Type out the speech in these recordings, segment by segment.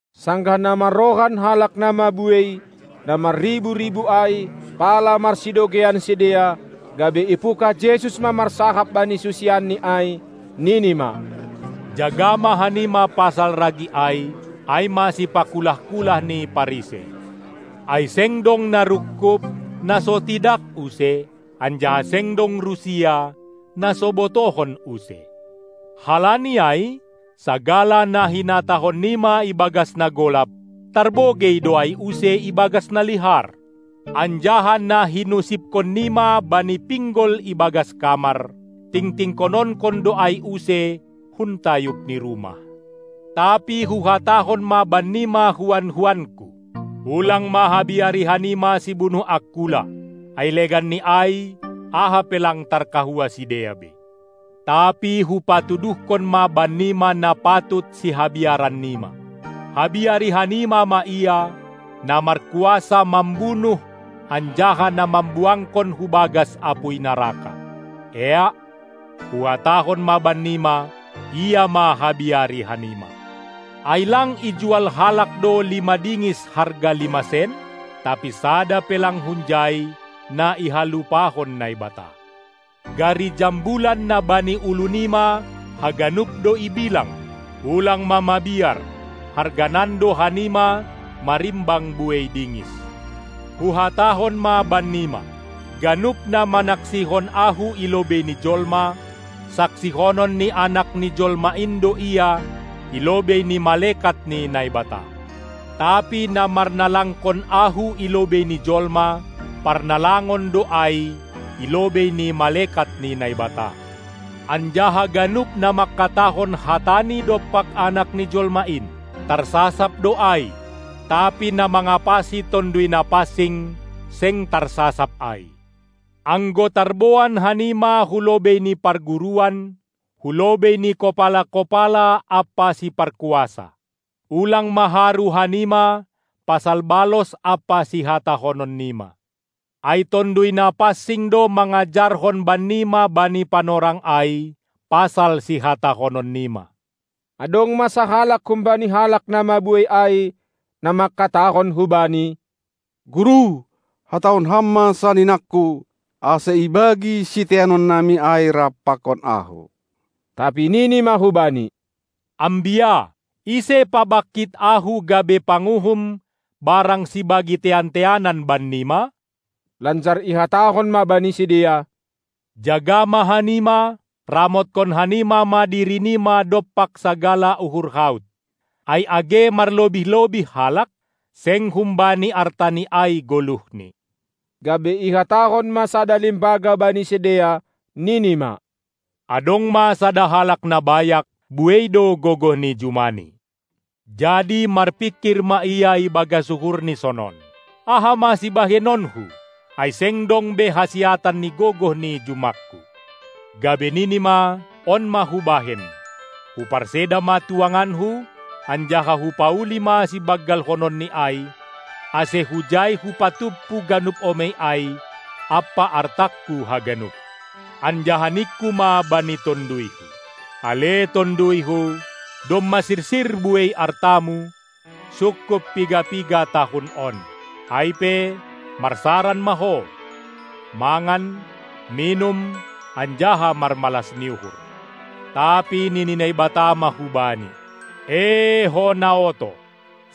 Sanggah na marrohan halak na mabuei, na marribu-ribu ai, pala marsidogeian sidea, gabe ipungkah Jesus ma marsahap bani susianNi ai, nini ma: Jaga ma hanima pasal ragi ai, ai ma sipakulah-kulah ni Parisei. Ai seng dong na rungkub, na so tidak use, anjaha seng dong rusia, na so botohon use. Halani ai sagala na hinatahon nima ibagas na golap, tarbogei do ai use ibagas na lihar, anjaha na hinusipkon nima bani pinggol ibagas kamar, tingtingkononkon do ai use hun tayub ni rumah. Tapi Huhatahon ma bannima huan-huanKu: Ulang ma habiari hanima sibunuh angkula, ai legan ni ai aha pe lang tarkahua sidea be. Tapi Hupatuduhkon ma bannima na patut sihabiaran nima. Habiari hanima ma Ia, na markuasa mambunuh anjaha na mambuangkon hubagas apuy naraka. Eak, Huhatahon ma bannima, Ia ma habiari hannima! Ai lang ijual halak do lima dingis harga lima sen? Tapi sada pe lang hunjai, na ihalupahon Naibata. Gari jambulan na bani ulu nima haganup do ibilang. Ulang ma mabiar, harganan do hanima marimbang buei dingis. Huhatahon ma bannima: Ganup na manaksihon Ahu i lobei ni jolma saksihonon ni Anak ni Jolma in do ia i lobei ni malekat ni Naibata. Tapi na marnalangkon Ahu i lobei ni jolma, parnalangon do ai i lobei ni malekat ni Naibata. Anjaha ganup na mangkatahon hatani dompak Anak ni jolma in, tarsasap do ai, tapi na mangapasi Tonduy Napansing, seng tarsasap ai. Anggo tarboan hanima hulobei ni parguruan, hulobei ni kopala-kopala ampa siparkuasa, ulang ma haru hanima pasal balos ampa sihatahonon nima. Ai Tonduy Napansing do mangajarhon bannima bani panorang ai pasal sihatahonon nima. Adong ma sahalak humbani halak na mabuei ai, na mangkatahon hu Bani: Guru, hatahon Ham ma saninangku, ase ibagi siteanon nami ai rap pakon ahu. Tapi nini ma hubani: Ambia! Ise pabangkit Ahu gabe panguhum barang sibagi tean-teanan bannima? Lanjar ihatahon ma bani sidea: Jaga ma hanima ramotkon hanima ma diri nima dompak sagala uhur haut! Ai age marlobih-lobih halak, seng humbani artani ai goluhni. Gabe ihatahon ma sada limbaga bani sidea, nini ma: Adong ma sada halak na bayak, buei do gogoh ni jumani. Jadi marpingkir ma ia ibagas uhurni sonon: Aha ma sibahenonku? Ai seng dong be hasiatan ni gogoh ni jumangku. Gabe nini ma: On ma hubahen: Huparseda ma tuanganku, anjaha hupauli ma sibanggalhononni ai, ase hujai hupatumpu ganup omei ai ampa artangku haganup. Anjaha ningku ma bani tonduyhu: Ale tonduyhu, domma sirsir buei artamu, sungkup piga-piga tahun on. Ai pe, marsaran ma ho, mangan, minum anjaha marmalas ni uhur. Tapi nini Naibata ma hubani: Ee ho na oto!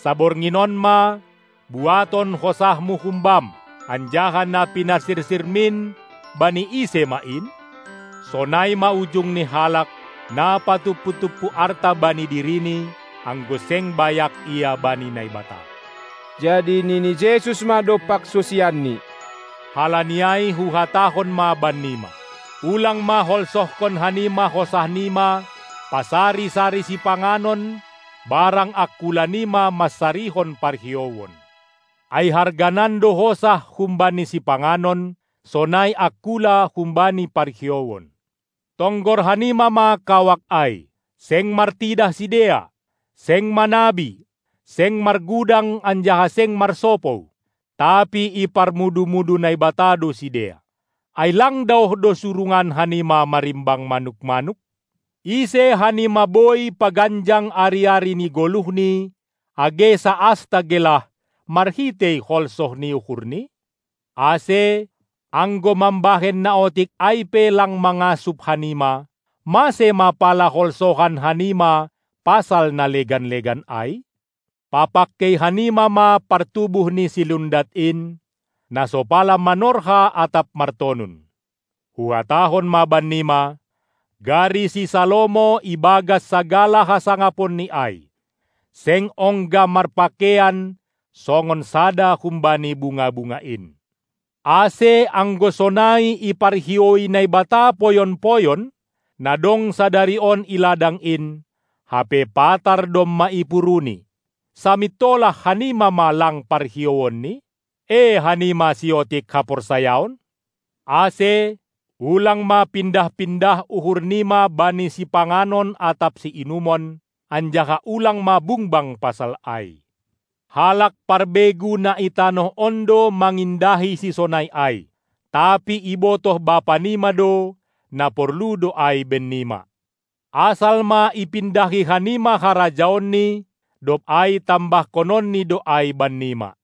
Saborngin on ma buaton hosahmu humbam. Anjaha na pinasirsirmin bani ise ma in? Sonai ma ujung ni halak, na patumpu-tumpu arta bani dirini, anggo seng bayak ia bani Naibata. Jadi nini Jesus ma dompak susianNi: Halani ai huhatahon ma bannima: Ulang ma holsohkon hanima hosahnima pasari-sari sipanganon barang angkula nima mansarihon parhiouon. Ai harganan do hosah humbani sipanganon sonai angkula humbani parhiouon. Tonggor hanima ma kawak ai: Seng martidah sidea, seng manabi, seng margudang anjaha seng marsopou, tapi iparmudu-mudu Naibata do sidea. Ai lang daoh do surungan hanima marimbang manuk-manuk? Ise hanima boi paganjang ari-ari ni goluhni age saasta gelah, marhitei holsoh ni uhurni? Ase, anggo mambahen na otik ai pe lang mangasup hanima, mase ma pala holsohan hanima pasal na legan-legan ai? Papangkei hanima ma partubuh ni silundat in, na so pala manorha atap martonun. Huhatahon ma bannima: Gari si Salomo ibagas sagala hasangaponni ai, seng ongga marpakeian songon sada humbani bunga-bunga in. Ase anggo sonai iparhioui Naibata poyon-poyon, na dong sadari on i ladang in, hape patar domma ipuruni, samintolah hanima ma lang parhiouanNi? E hanima siotik haporsayon? Ase ulang ma pindah-pindah uhur nima bani sipanganon atap siinumon, anjaha ulang ma bungbang pasal ai. Halak parbegu na i tanoh on do mangindahi sisonai ai, tapi ibotoh Bapa nima do, na porlu do ai bennima. Asal ma ipindahi hanima harajaonNi, dob ai tambahkononNi do ai bannima.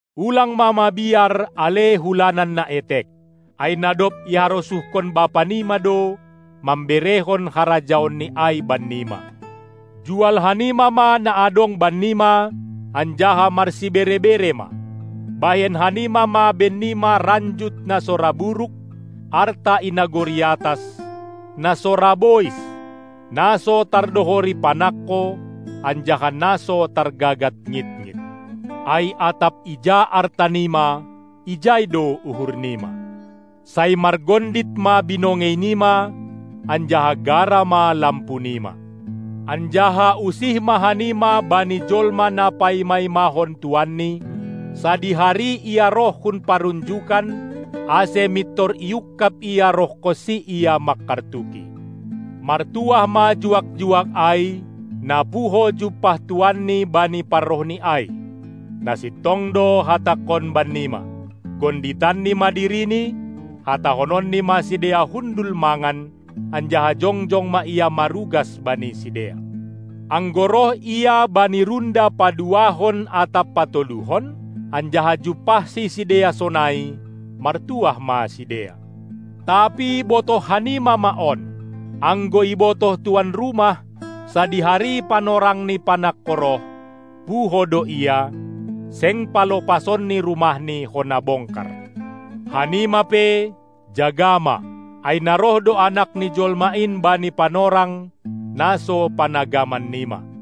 Ulang ma mabiar, ale hulanan na etek! Ai na dob iharosuhkon Bapa nima do, mamberehon harajaonNi ai bannima. Jual hanima ma na adong bannima anjaha marsibere-bere ma. Bahen hanima ma bennima ranjut na so ra buruk, arta i nagori atas, na so ra bois, na so tardohori panangko anjaha na so targagat ngitngit. Ai atap ija arta nima, ijai do uhur nima. Sai margondit ma binongei nima anjaha gara ma lampu nima. Anjaha usih ma hanima bani jolma na paima-imahon tuanni, sadihari ia roh hun parunjukan, ase mintor iungkab ia rohkonsi ia mangkartuki. Martuah ma juak-juak ai, na puho jumpah tuanni bani parrohni ai. Na sintong do hatangkon bannima: Gonditanni ma dirini, hatahononni ma sidea hundul mangan, anjaha jongjong ma ia marugas bani sidea. Anggo roh ia bani runda paduahon atap patoluhon, anjaha jumpahsi sidea sonai, martuah ma sidea. Tapi botoh hanima ma on: Anggo ibotoh tuan rumah, sadihari panorang ni panangko roh, puho do ia, seng palopasonni rumahni hona bongkar. Hanima pe, jaga ma, ai na roh do Anak ni jolma in bani panorang, na so panagaman nima.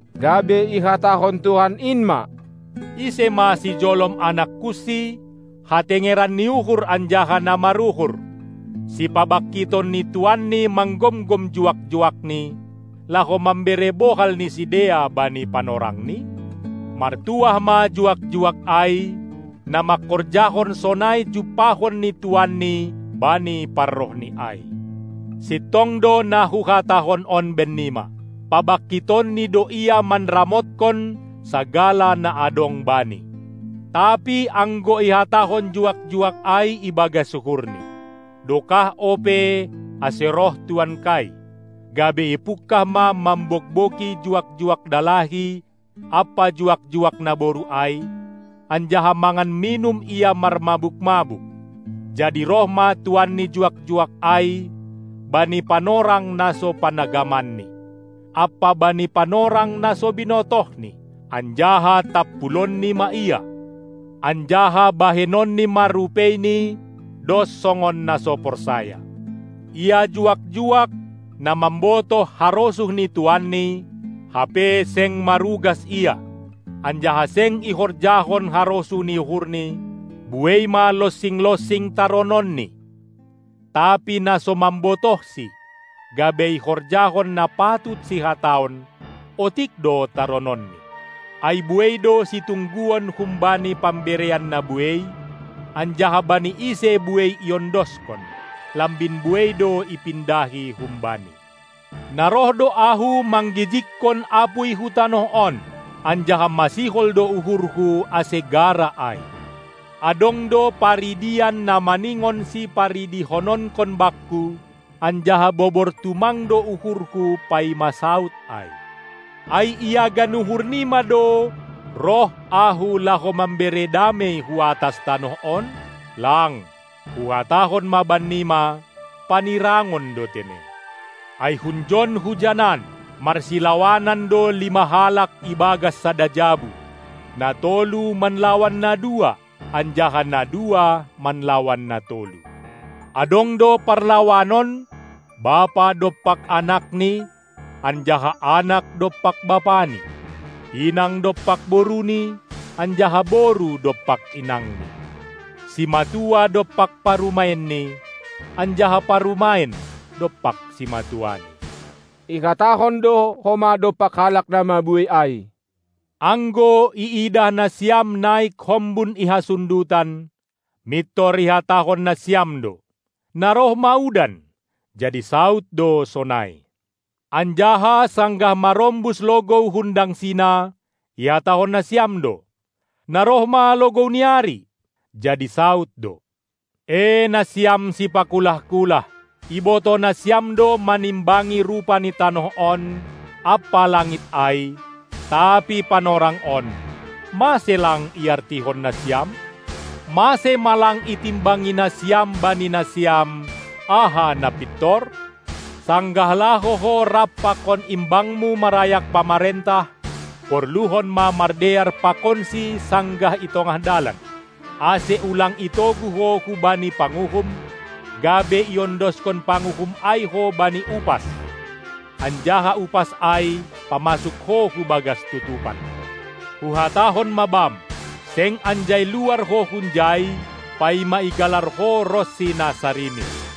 Gabe ihatahon Tuhan in ma: Ise ma sijolom anakkunsi, hatengeran ni uhur anjaha na maruhur, sipabangkiton ni tuanni manggomgom juak-juakni, laho mambere bohal ni sidea bani panorangni. Martuah ma juak-juak ai, na mangkorjahon sonai jumpahon ni tuanni bani parrohni ai. Sintong do na Huhatahon on bennima: Pabangkitonni do ia manramotkon sagala na adong bani. Tapi anggo ihatahon juak-juak ai ibagas uhurni: Dokah ope, ase roh tuankai, gabe ipungkah ma mambogbogi juak-juak dalahi ampa juak-juak naboru ai, anjaha mangan minum ia marmabuk-mabuk, Jadi roh ma tuan ni juak-juak ai bani panorang na so panagamanni, ampa bani panorang na so binotohni, anjaha tampulonni ma ia, anjaha bahenonni ma rupeini dos songon na so porsaya. Ia juak-juak, na mambotoh harosuh ni tuanni, hape seng marugas ia, anjaha seng ihorjahon harosuh ni uhurni, buei ma lonsing-lonsing tarononni, Tapi na so mambotohsi, gabe ihorjahon na patut sihataon, otik do tarononni. Ai buei do situngguon humbani pamberean na buei, anjaha bani ise buei iondoskon, lambin buei do ipindahi humbani. Na roh do Ahu manggijigkon apuy hu tanoh on, anjaha masihol do uhurhu ase gara ai! Adong do paridian na maningon siparidihononkon Bakku, anjaha bobor tumang do uhurHu paima saud ai. Ai iagan uhur nima do, roh Ahu, laho mambere damei hu atas tanoh on? Lang, Huhatahon ma bannima, panirangon do tene. Ai hunjon hujanan marsilawanan do lima halak ibagas sada jabu, na tolu manlawan na dua, anjaha na dua manlawan na tolu. Adong do parlawanon, bapa dompak anakni anjaha anak dompak bapani, inang dompak boruni anjaha boru dompak inangni, simatua dompak parumaenni anjaha parumaen dompak simatuani. Ihatahon do homa dompak halak na mabuei ai: Anggo iidah nasiam naik hombun i hasundutan, mintor ihatahon nasiam do: Na roh ma udan, jadi saud do sonai. Anjaha sanggah marombus logou hun dangsina, ihatahon nasiam do: Na roh ma logou ni ari, jadi saud do. E nasiam sipakulah-kulah, ibotoh nasiam do manimbangi rupa ni tanoh on ampa langit ai, tapi panorang on, mase lang iartihon nasiam? Mase ma lang itimbangi nasiam bani nasiam, aha na pintor? Sanggah laho ho rap pakon imbangmu marayak pamarentah, porluhon ma mardear pakonsi sanggah i tongah dalan, ase ulang itogu ho hubani panguhum, gabe iondoskon panguhum ai ho bani upas, anjaha upas ai pamasuk ho hubagas tutupan. Huhatahon ma bam, seng anjai luar ho hunjai, paima igalar ho ronsi na sarimis.